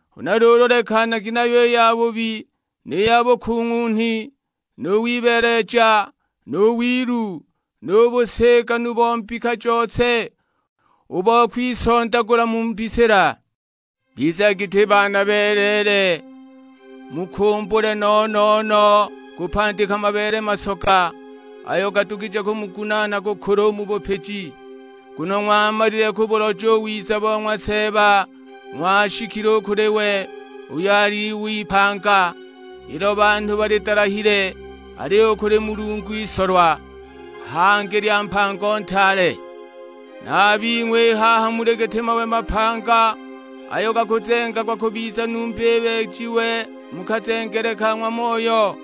Huna luulu lekanagi nayo i yabubi ni ya bukung'unhi, nu wibeeleja, nu wilu, nu busigani bo mbika jose, u bo kwisondagula mu mbisila. Bizagi giti baana beleele, mukumbule no-no-no kupandika mabeele masoga, ayo gadugije kumugunaana kukula u mu bupiji. Nguno ng'wamalile kubuloja u wiza bo ng'wa Seeba; ng'washikile u kuli we, uyo ali Iwe ipanga, ilo banhu balidalahile, aliyo u kuli Mulungu isolwa, hangi lya mpango ntaale. Na a bing'we i haha muli giti mawe mapanga, ayo gakuzengagwa kubiza numba ibeejiwe mu kazengele ka ng'wa Moyo,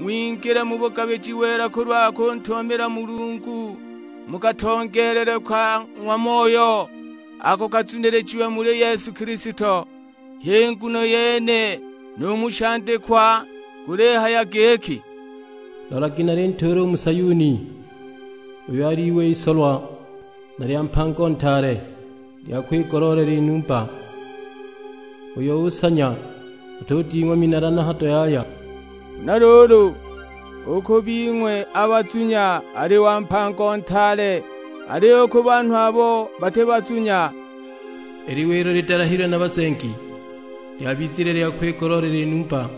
ng'wingile mu bugabiji wela kulwa kuntumamila Mulungu mu katongeelelwe ka ng'wa Moyo, ako kazunilijiwe muli Yesu Kilisto. H'i nguno yene nu mu shandikwa gulihaya giki, "Lolagi nalintuula u mu Sayuni, uyo ali Iwe isolwa na lya mpango ntaale, lya kwigoloolela i numba; uyo unsanya atuding'wa minala na hado yaya." Huna luulu, u ku bing'we a bazunya ali wa mpango ntaale, aliyo u ku banhu abo bati bazunya, "I Liwe ilo lidalahilwe na bazengi, lyabizile lya kwigoloolela i numba.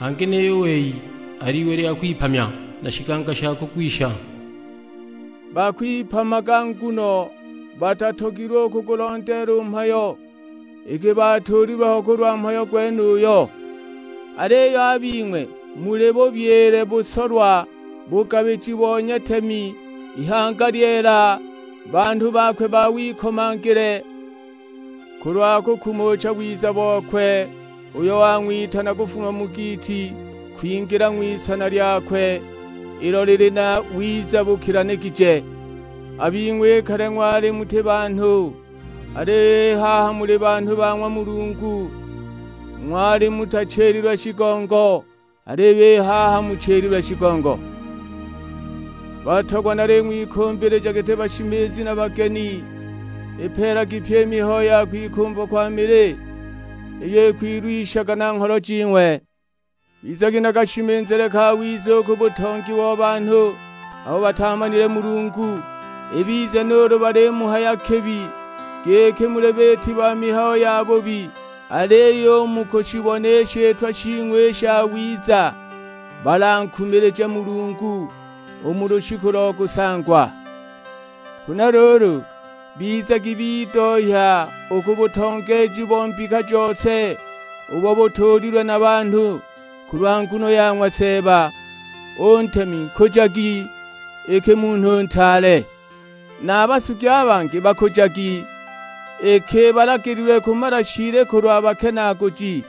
Hangi niyo u wei ali Iwe lya kwipamya, na shiganga sha kugwisha." Bakwipamaga nguno batatogilwe u kugulondeela u mhayo, iki batuulilwe ho kulwa mhayo gwenuyo! Aliyo a bing'we muli bubyile busolwa, bugabiji bo nyatemi, ihanga lyeela, banhu bakwe ba wikomangile, kulwa kukumucha wiza bokwe uyo wang'witana kufuma mu giiti kwingila ng'wisana lyakwe ilo lili na wiza bukilanigije. A bing'we i kale ng'wali muti banhu, aliyo i haha muli banhu ba ng'wa Mulungu; ng'wali mutachililwe shigongo, aliyo i haha muchililwe shigongo. Batogwa naling'wikumbilija giti bashimizi na bageni, ipeelagi pyi i mihayo ya kwikumva kwa mili, iyo ikwilwishaga na ngholo jing'we. Bizagi na kashimizile kawiza u ku butongi bo banhu abo batamanile Mulungu, ibize nuulu balimuhaya kibi giki muli biiti ba mihayo yabubi, aliyo u mu kushibona i shitwa shing'we i shawiza balankumilije Mulungu, u mu lushiku lo kusangwa. Huna luulu, bizagi bidohya u ku butongeeji bo mbika jose ubo butuulilwe na banhu, kulwa nguno ya ng'wa Seeba; u ntemi nkujagi iki munhu ntaale. Na a basugi a bangi bakujagi, iki balagililwe kumala shiili kulwa bakenaaguji,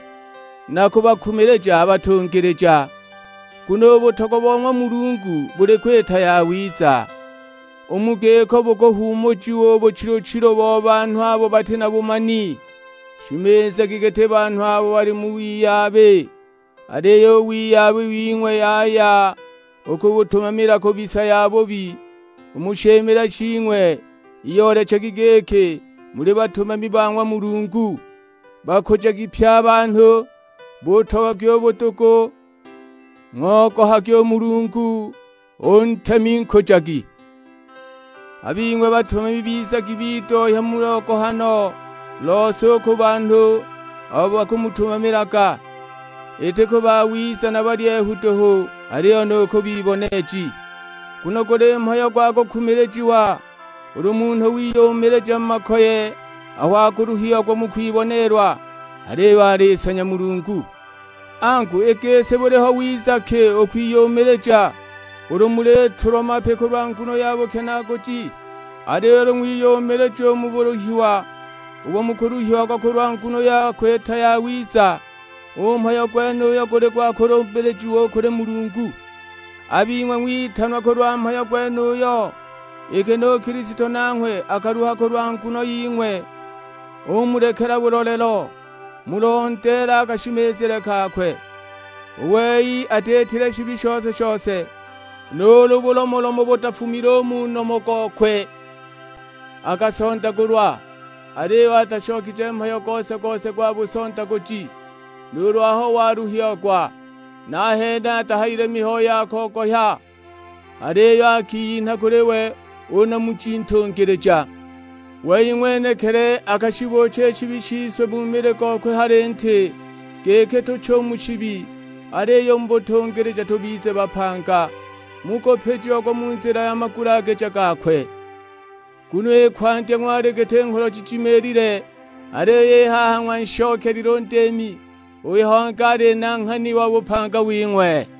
na kubakumilija a batungilija. Nguno u butogwa bo ng'wa Mulungu buli kwita yawiza; u mu giko bukuhuumujiwa u buchilu-chilu bo banhu abo bati na bumani. Shimizagi giti banhu abo bali mu wiyabi, aliyo u wiyabi wing'we yaya u kubutumamila kubisa yabubi; u mu shimile shing'we iyoolechagi giki muli batumami ba ng'wa Mulungu. Bakujagi pye a banhu, butogagwi u budugu, ng'ogohagi u Mulungu, u ntemi nkujagi. A bing'we batumami bizagi bidohya mu logohano lose u ku banhu abo mukubatumamilaga, iti ku bawiza na balyehu duhu, aliyo nu ku biboneeji. Nguno guli mhayo gwa kukumilijiwa ulu munhu wiyumilija mu makoye aho akuluhiagwa mu kwiboneelwa, aliyo alinsanya Mulungu. Angu, i gisi buliho wiza ki u kwiyumilija ulu mulitulwa mapi kulwa nguno ya bukenaaguji? Aliyo ulu ng'wiyumilija u mu buluhiwa ubo mukuluhiagwa kulwa nguno ya kwita yawiza, u mhayo gwenuyo guli gwa kulumbilijiwa u kuli Mulungu. A bing'we ng'witanwa kulwa mhayo gwenuyo, iki nu Kilisto nanghwe akaluha kulwa nguno ying'we; umulekela bulolelo, mulondeele a kashimizile kakwe. U wei atiitile shibi shose-shose, nuulu bulomolomo butafumile u mu nomo gokwe. Akasondagulwa, aliyo atashokije mhayo gose-gose gwa busondaguji. Nuulu aho waluhiagwa nahene atahayile mihayo ya kogohya, aliyo akiyinha kuli we u Namuji Ntungilija. Wei ng'wenekili akashibuucha i shibi shise mu mili gokwe ha linti, giki tuche u mu shibi, aliyo u mu butungilija tubize bapanga; mukupijiagwa mu nzila ya magulagije gakwe. Nguno i kwandya ng'wali giti ngholo jijimiilile; aliyo i haha ng'wanshokelile u Ndiimi, uyo hangi ali Nanghani wa bupanga wing'we.